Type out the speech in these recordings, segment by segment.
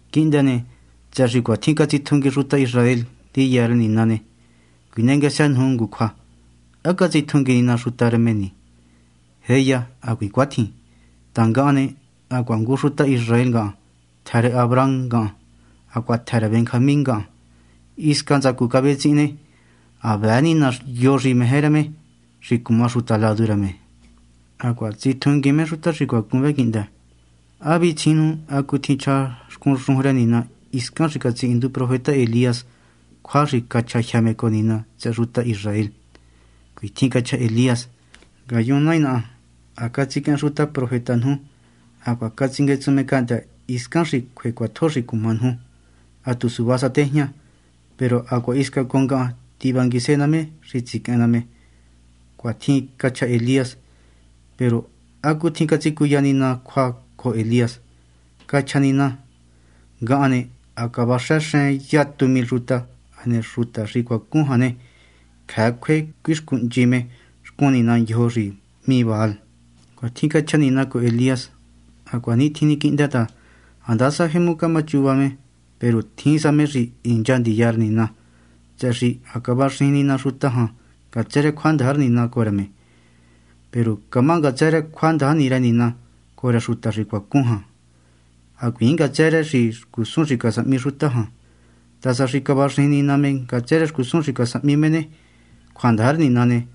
Quihndë ne, tsëhë xi cuatjin catsitjungui xuta Israel ndiya rë Nina ne, cuinengësë nuju ngu cjua: ¿há catsitjungui Nina xuta rë me ni? ¡Jéya, hacuiin cuatjin! Ta ngahan ne, hacuaha ngu xuta Israel ngahan, tjë rë Abraham ngahan, hacuaha tjë rë Benjamín ngahan. Hisca ntsacu cavetsihin ne, ha vëë Nina yo xi meje rë me xi cuma xuta ladu rë me, hacuaha tsitjunguiin me xuta xi cuacun vë quihndë. ¿Há vitsijiin nuju hacutjin chja xcun xujun rë Nina hiscan xi catsihindu profeta Elías cjua xi cachjajyë me cojo Nina tsëhë xuta Israel? Cuitjin cachja Elías: “Ngayun, Nai naha, ha catsiquehen xuta profeta nuju hacuaha ha catsinguetsun me cahndë́ hiscan xi cjue cjuatjo xi cuma nuju. Ha tu suva sa tejña, peru hacuaha hisca cojo ngahan tivanguise ná me xi tsiquehen ná me.” Cuatjin cachja Elías. Peru ¿hacutjin catsicuya Nina cjua cojo Elías? Cachja Nina: “Ngahan ne, ha cavaxëxen yatu mil xuta, hane xuta xi cuacun jan ne, cjëë cjue cuixcuhnchi me xcun nina ndyojo xi hmí Baal.” Cuatjin cachja Nina cojo Elías. Hacuanitjin ni quihndë ta handasa jemu camachuva me peru tjin sa me xi hincha ndiya rë Nina ta, tsëhë xi cavaxijin Nina xuta jan ngatsë rë cjuandaja rë Nina cojo rë me. Peru camá ngatsë rë cjuandaja ni rë Nina cojo rë xuta xi cuacun vë, hacuiin ngatsë rë xcusun xi casahmi xuta jan. Ta sa xi cavaxijin Nina me ngatsë rë xcusun xi casahmi me ne, cjuandaja rë Nina ne,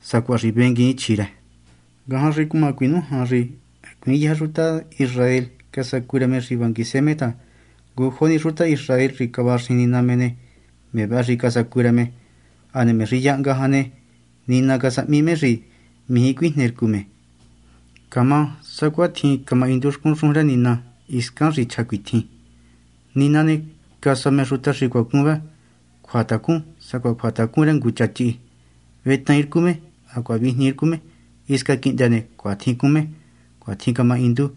sacuaha xi venguiin chjí rë. Ngajan xi cuma cuinújan xi hacuiin yëjë xuta Israel xi casacu rë me xi vanguise me ta ngujo ni xuta Israel xi cavaxijin Nina ne, me vëhë ni casacu rë me. Hane me xi yahnga jan ne, Nina casahmi me xi mijí cuijnercu me. Camá sacuatjin camahindu xcun xujun rë Nina hiscan xi chja cuitjin: “Nina ne, casua me xuta xi cuacun vë ngu cjuatacun sacuaha cjuatacun rë ngu cha chihi. Vetaain rcu me hacuaha vijnii rcu me. Hisca quihndë ne, cuatjin cún me.” Cuatjin camahindu.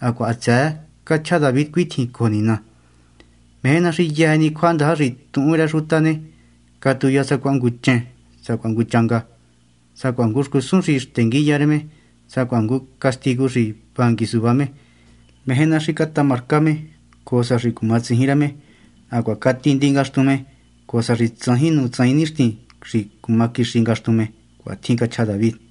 Hacuaha hatsëë cachja David cuitjin cojo Nina: Meje ná xi yëjë ni cjuandaja xi tuhun rë xuta ne, catuya sacuaha ngu chen, sacuaha ngu changa, sacuaha ngu xcusun xi xtenguiya rë me, sacuaha ngu castigu xi vangui suvá me. Meje ná xi catama rcá me, cojo sa xi cumatsijin rë me; hacuaha catindi ngaxtun me, cojo sa xi tsajin nu tsajin nixtin xi cuma quixi ngaxtun me. Cuatjin cachja David.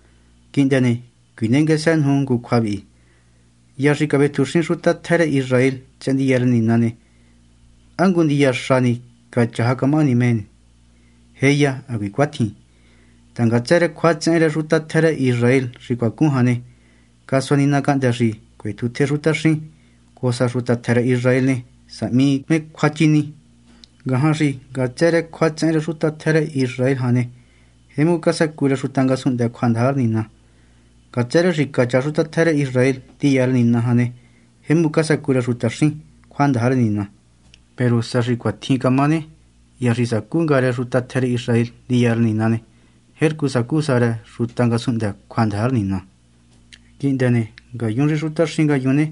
Quihndë ne, cuinengësë nuju ngu cjua vi: Hya xi cavetjuxin xuta tjë rë Israel tsëhë ndiya rë Nina ne, ¿há ngu ndiya xa ni cachaja camahani me? ¡Jéya, hacuiin cuatjin! ta ngatsë rë cjuatsehen rë xuta tjë rë Israel xi cuacun jan ne, casua Nina cahndë́ xi cuetjutje xutaxín, cojo sa xi xuta tjë rë Israel ne, sahmi me cjuachini. Ngajan xi ngatsë rë cjuatsehen rë xuta tjë rë Israel jan ne, jemu casacu rë xuta ngasunhndë cjuandaja rë Nina. Ngatsë rë xi cachaja xuta tjë rë Israel ndiya rë Nina ne, jemu casacu rë xutaxín cjuandaja rë Nina. Peru sa xi cuatjin camá ne, hya xi sacú nga rë xuta tjë rë Israel ndiya rë Nina ne, jercu sacú sa rë xuta ngasunhndë cjuandaja rë Nina. Quihndë ne, ngayun xi xutaxín ngayun ne,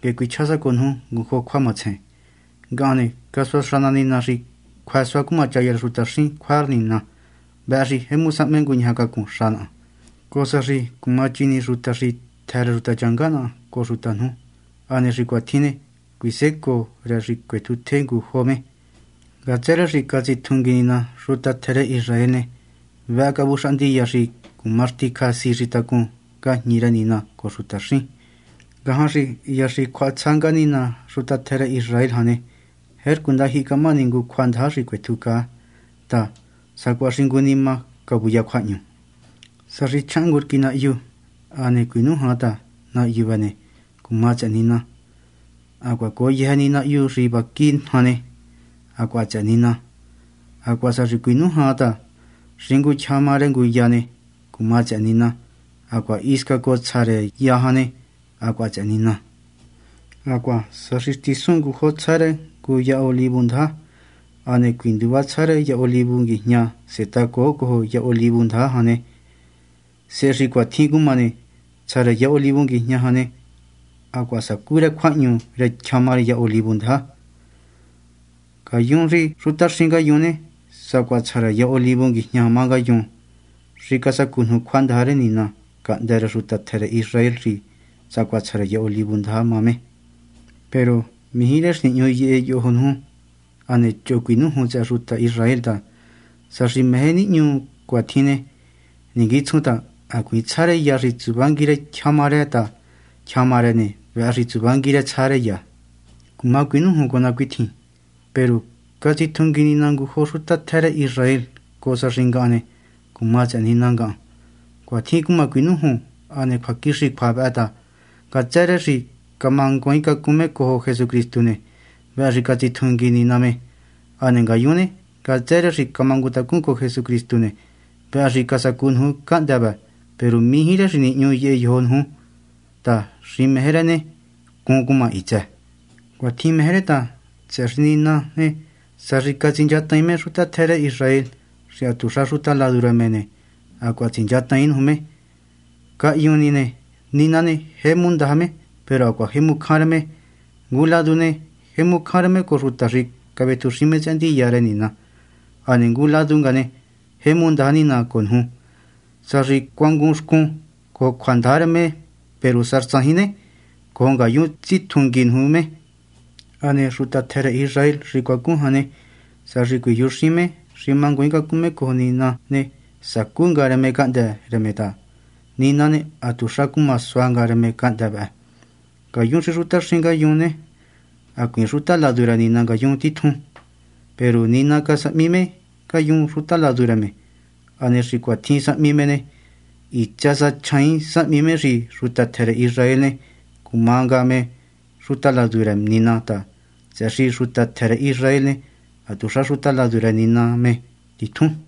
nguehe cuichjá sa cojo nuju ngu jo cjua matsejen. Ngahan ne, casuaxa ná Nina xi cjuë suá cumachaya rë xutaxín cjua rë Nina. Vëhë xi jemu sahme nguñajacacun xa naha, cojo sa xi cuma chini xuta xi tjë rë xutachanga naha cojo nuju. Hane xi cuatjin ne, cuisécoo rë xi cuetjutje ngu jo me. Ngatsë rë xi catsitjungui Nina xuta tjë rë Israel ne, vëhë cavuxaha ndiya xi cuma xticja si xi tacun ngajñi rë Nina cojo xutaxín. Ngajan xi hya xi cjuahatsja nga Nina xuta tjë rë Israel jan ne, jercu ndajyihi camahani ngu cjuandaja xi cuetjucaa ta, sacuaha xi ngu nima cuya cjuahñu. Sa xi chjahan ngu rquí nahyu hane cuinújan ta nahyu vëhë ne, cuma tsëhë Nina, hacuaha cojo yëjë ni nahyu xi vaqui jan ne, hacuaha tsëhë Nina. Hacuaha sa xi cuinújan xi tyjama rë ngu ya ne, cuma tsëhë Nina, hacuaha hisca cojo tsja rë ya jan ne, hacuaha tsëhë Nina. Hacuaha sa xi xtisun ngujo tsja rë ngu ya olivu ndaja hane cuinduva tsja rë ngu ya olivu nguijña setahacoo cojo ya olivu ndaja jan ne, sehe xi cuatjin cuma ne, tsja rë ya olivu nguijña jan ne, hacuaha sacú rë cjuahñu rë tyjama rë ya olivu ndaja jan. Ngayun xi xutaxín ngayun ne, sacuaha tsja rë ya olivu nguijña má ngayun, xi casacu nuju cjuandaja rë Nina cahndë́ rë xuta tjë rë Israel xi sacuaha tsja rë ya olivu ndaja má me. Peru mijí rë xi nihñu yehe yojo nuju hane choho cuinújun tsëhë xuta Israel ta, sa xi meje nihñu cuatjin ne, ninguitsjun ta hacuiin tsja rë ya xi tsuvangui rë tyjama rë ta tyjama ne, vëhë tsuvangui rë tsja rë ya. Cuma cuinújun cojo ná cuitjin: “Peru catsitjungui Nina ngu jo xuta tjë rë Israel cojo sa xi ngahan ne, cuma tsëhë Nina ngahan.” Cuatjin cuma cuinújun hane cjuaquixi cjua vëhë. Ngatsë rë xi camanguaaincacun me cojo Jesucristu ne, vëhë xi catsitjungui Nina me. Hane ngayun ne, ngatsë ni rë xi camangutacun cojo Jesucristu ne, vëhë xi casacu nuju cahndë́ vë. Peru mijí rë xi nihñu jyë yojo nuju ta xi meje rë ne, rcun cuma hitsë. Cuatjin meje rë ta, tsëhë xi Nina ne, sa xi catsinchataain me xuta tjë rë Israel xi hatuxa xuta ladu rë me ne, hacuaha tsinchataain nuju me. Cahyun ni ne, Nina ne, jemu ndaja me peru hacuaha jemu cjan rë me. Ngu ladu ne, jemu cjan rë me cojo xuta xi cavetjuxin me tsëhë ndiya rë Nina. Hane ngu ladu nga ne, jemu ndaja Nina cojo nuju, sa xi cuangunxcun cojo cjuandaja rë me. Peru sa tsajin ne, cojo ngayun tsitjungui nuju me. Hane xuta tjë rë Israel xi cuacun jan ne, sa xi cuiyujuxín me xi manguaaincacun me cojo Nina ne, sacú nga rë me cahndë́ rë me ta Nina ne, hatuxa cuma sua nga me cahndë́ vëhë. Ngayun xi xutaxín ngayun, hacuiin xuta ladu rë Nina ngayun titjun ne, peru Nina casahmi me ngayun xuta ladu rë me. Hane xi cuatjin sahmi me ne, hitsë sa chjaain sahmi me xi xuta tjë rë Israel ne, cuma nga me xuta ladu rë Nina ta, tsëhë xi xuta tjë rë Israel ne, hatuxa xuta ladu rë Nina me titjun.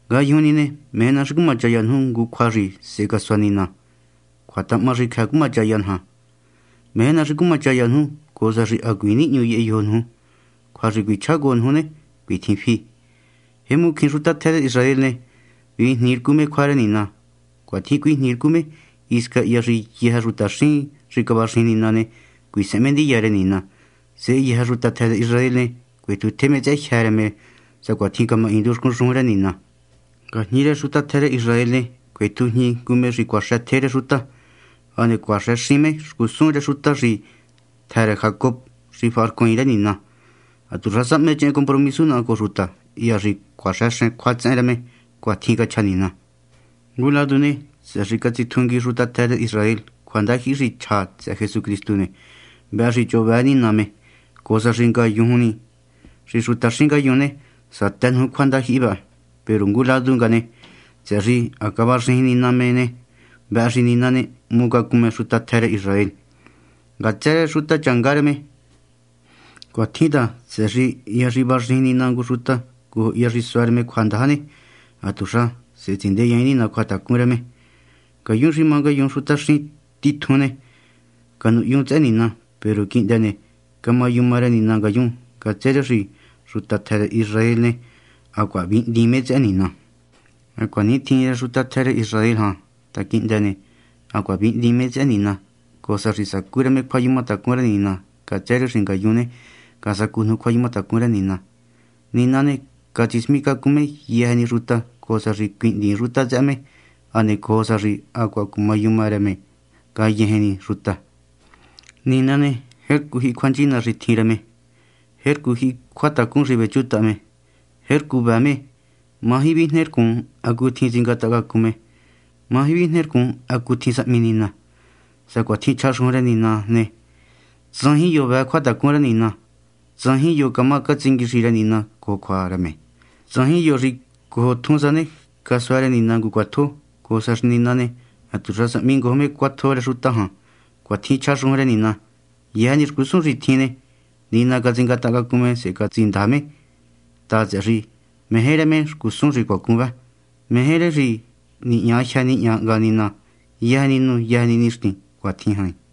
Ngayujun ni ne, meje ná xi cumachaya nuju ngu cjua xi sehe casua Nina, cjuatahahma xi cjëë cumachaya naja. Meje ná xi cumachaya nuju cojo sa xi hacuiin nihñu yehe yojo nuju. Cjua xi cuichjá cojo nuju ne, cuitjin fi: jemu cjín xuta tjë rë Israel ne, vijnii rcu me cjua rë Nina. Cuatjin cuijnii rcu me hisca hya xi yëjë xutaxín xi cavaxijin Nina ne, cuisehen me ndiya rë Nina. Sehe yëjë xuta tjë rë Israel ne, cuetjutje me tsëhë jyë́ rë me sacuatjin camahindu xcun xujun rë Nina: Ngajñi rë xuta tjë rë Israel ne, cuetjujñi ngu me xi cuaxëtje rë xuta, hane cuaxëxín me xcusun rë xuta xi tjë rë Jacob xi faharcuaain rë Nina. Hatuxa sahmechehen compromisu naha cojo xuta, hya xi cjuaháxen cjuatsehen rë me. Cuatjin cachja Nina. Ngu ladu ne, tsëhë xi catsitjungui xuta tjë rë Israel cjuandajyihi xi chja tsëhë Jesucristu ne, vëhë xi choho vëë Nina me, cojo sa xi ngayun xi xutaxín ngayun ne, satë nuju cjuandajyihi vëhë. Peru ngu ladu nga ne, tsëhë xi ha cavaxijin Nina me ne, vëhë xi Nina ne, hmucacun me xuta Israel jan, ngatsë rë xutachanga rë me. Cuatjin ta tsëhë xi hya xi vaxijin Nina ngu xuta cojo hya xi sua rë me cjuandaja ne, hatuxa sehe tsindeyaain Nina cjuatacun rë me. Ngayun xi má yun xutaxín, titjun ne, canuhyun tsëhë Nina. Peru quihndë ne, camayuma rë Nina ngayun ngatsë rë xi xuta tjë rë Israel ne, hacuaha vihndiin me tsëhë Nina. Hacuanitjin rë xuta tjë rë Israel jan ta quihndë ne, hacuaha vihndiin me tsëhë Nina, cojo sa xi sacú rë me cjuayumatacun rë Nina ngatsë rë xi ngayun ne, casacu nuju cjuayumatacun rë Nina. Nina ne, catsismicacun me yëjë ni xuta, cojo sa xi cuihndiin xuta tsëhë me, hane cojo sa xi hacuaha cumayuma rë me ngayëjë ni xuta. Nina ne, jercu jyihi cjuanchina xi tjin rë me, jercu jyihi cjuatacun xi vechutaha me, jercu vëë me. Maji vijnercun hacutjin tsingatahacacun me. Maji vijnercun hacutjin sahmi Nina. Sacuatjin chja xujun rë Nina ne: “Tsajin yo vëë cjuatacun rë Nina. Tsajin yo camá catsinguixi rë Nina cojo cjua rë me. Tsajin yo xi cojo tjun sa ne, casua rë Nina ngu cjuatjo, cojo sa xi Nina ne, hatuxa sahmi ngojo me cjuatjo rë xuta jan.” Cuatjin chja xujun rë Nina. Yëjë ni xcusun xi tjin ne, Nina catsingatahacacun me sehe catsindaja me ta, tsëhë xi meje rë me xcusun xi cuacun vë. Meje rë xi nihña jyë nihña hnga Nina yëjë ni nu yëjë ni nixtin. Cuatjin jain.